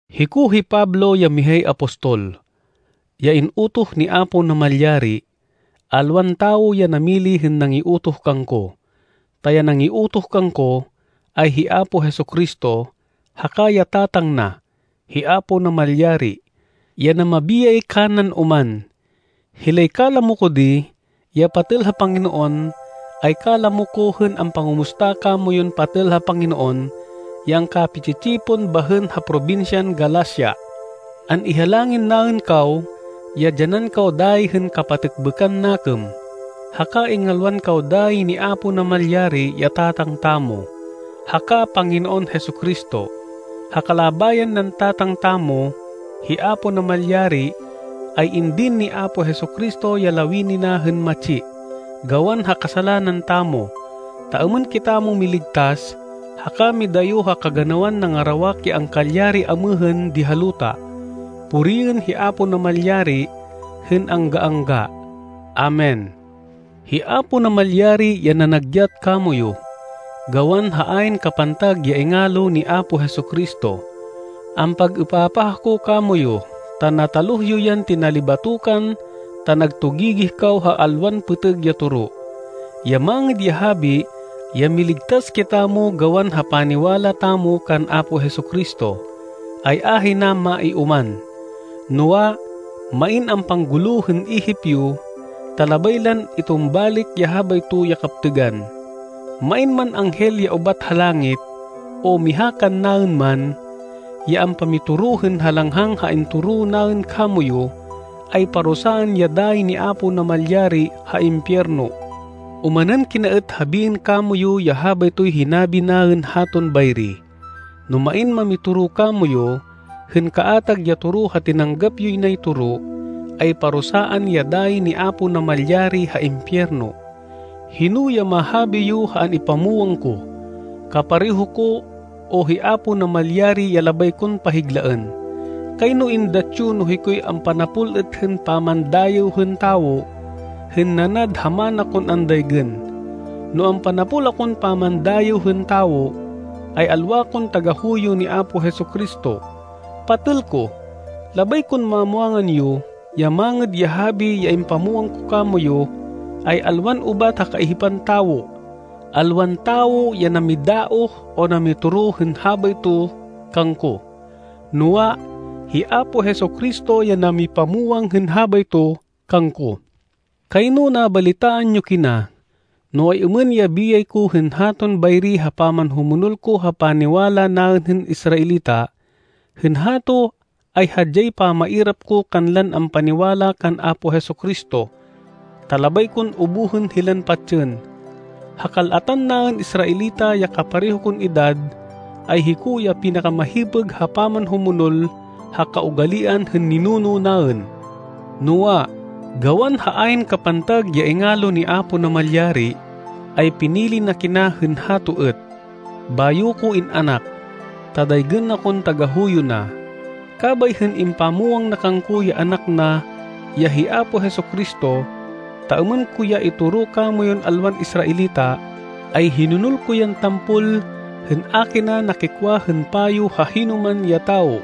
Hiko hi Pablo ya mihay apostol, ya in-utoh ni Apo Namalyari. Alwan tawo ya namili hên nangiutoh kangko, ta ya nangiutoh kangko, ay hi Apo Jesu-Cristo, haka ya Tatang na, hi Apo Namalyari, ya namabiyay kanan oman. Hilay kalamo ko di, ya patêl ha Panginoon, ay kalamo ko hên ampangumusta kamoyun patêl ha Panginoon ya angkapi-tsi-tsipon bahên ha probinsyan Galacia. An-ihalangin naên kaw ya dyanan kaw dayi hên kapatêkbêkan nakêm, haka ingalwan kaw dayi ni Apo Namalyari ya Tatang tamo, haka Panginoon Jesu-Cristo. Ha kalabayan nan Tatang tamo, hi Apo Namalyari, ay indin ni Apo Jesu-Cristo ya lawini na hên matsi, gawan ha kasalanan tamo, ta êmên kitamo miligtas haka midayo ha kaganawan nangarawak ya angkalyari amêhên di ha luta. Puriên hi Apo Namalyari hên angga-angga. Amen. Hi Apo Namalyari ya nanagyat kamoyu, gawan ha ayn kapantag ya ingalo ni Apo Jesu-Cristo. Ampag-êpapah ako kamoyu ta nataluh yo yan tinalibatokan ta nagtugigih kaw ha alwan pêtêg ya toro. Ya Mangêd ya Habi, ya miligtas kitamo gawan ha paniwala tamo kan Apo Jesu-Cristo, ay ahina maioman. Noa, main ampanggulo hên ihip yo ta labay lan itumbalik ya habayto ya kaptêgan. Main man anghel ya ubat ha langit, o miha kannaên man, ya ampamitoro hên halanghang ha intoro naên kamoyu, ay parusaan ya dayi ni Apo Namalyari ha impiyerno. Omanên kina êt habiên kamoyu ya habaytoy hinabi naên haton bayri, no main mamitoro kamoyu hên kaatag ya toro ha tinanggap yoy nay toro, ay parusaan ya dayi ni Apo Namalyari ha impiyerno. Hino ya mahabi yo ha an-ipamwang ko? Kapareho ko, o hi Apo Namalyari ya labay kon pahiglaên? Kayno êndat yo no hikoy ampanapol êt hên pamandayêw hên tawo, hên nanad ha mana kon andaygên. No ampanapol akon pamandayêw hên tawo, ay alwa kon tagahuyo ni Apo Jesu-Cristo. Patêl ko, labay kon mamwangan yo ya Mangêd ya Habi ya impamwang ko kamoyu, ay alwan ubat ha kaihipan tawo. Alwan tawo ya namidaoh o namitoro hên habayto kangko, noa, hi Apo Jesu-Cristo ya namipamwang hên habayto kangko. Kayno nabalitaan yo kina no ay-êmên ya biyay ko hên haton bayri ha pamanhumonol ko ha paniwala naên hên Israelita. Hên hato ay hadyay pamairap ko kanlan ampaniwala kan Apo Jesu-Cristo, ta labay kon ubuhên hilan patsên. Ha kal-atan naên Israelita ya kapareho kon edad ay hiko ya pinakamahipêg ha pamanhumonol ha kaugalian hên ninuno naên. Noa, gawan ha ayn kapantag ya ingalo ni Apo Namalyari, ay pinili na kina hên hato êt, bayo ko in-anak, ta daygên na kon tagahuyo na. Kabay hên impamwang na kangko ya Anak na ya hi Apo Jesu-Cristo, ta êmên ko ya itoro kamoyun alwan Israelita, ay hinonol ko yan tampol hên a kina nakikwa hên payo ha hinoman ya tawo.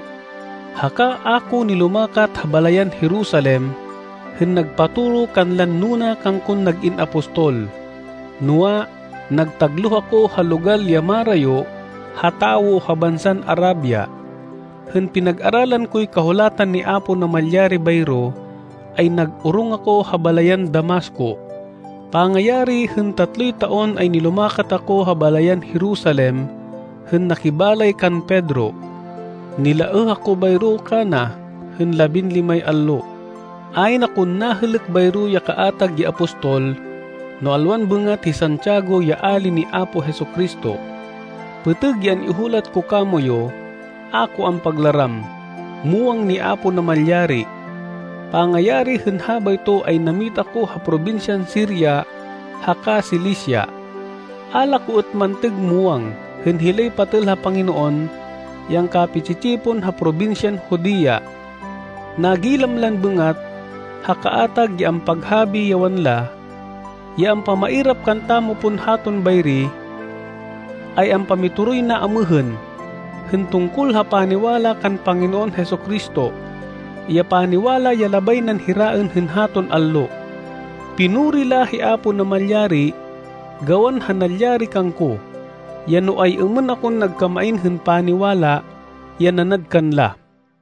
Haka a ko nilumakat ha balayan Jerusalem hên nagpatoro kanlan nuna kangkon nag-in apostol. Noa, nagtagloh ako ha logal ya marayo ha tawo ha bansan Arabia. Hên pinag-aralan koy kahulatan ni Apo Namalyari bayro, ay nag-orong ako ha balayan Damasco. Pangayari hên tatloy taon ay nilumakat ako ha balayan Jerusalem hên nakibalay kan Pedro. Nilaêh ako bayro kana hên labinlimay allo. Ayn akon nahêlêk bayro ya kaatag ya apostol no alwan bêngat hi Santiago ya ali ni Apo Jesu-Cristo. Pêtêg ya an-ihulat ko kamoyu. A ko ampaglaram. Muwang ni Apo Namalyari. Pangayari hên habayto ay nammita ko ha probinsyan Siria haka Cilicia. A la ko êt mantêg muwang hên hilay patêl ha Panginoon ya angkapi-tsi-tsipon ha probinsyan Judea. Nagilam lan bêngat ha kaatag ya ampaghabi ya wanla, “Ya ampamairap kantamo pon haton bayri, ay ampamitoroy na amêhên, hên tungkol ha paniwala kan Panginoon Jesu-Cristo, ya paniwala ya labay nan hiraên hên haton allo.” Pinuri la hi Apo Namalyari gawan ha nalyari kangko, ya no ay-êmên akon nagkamain hên paniwala ya nanad kanla.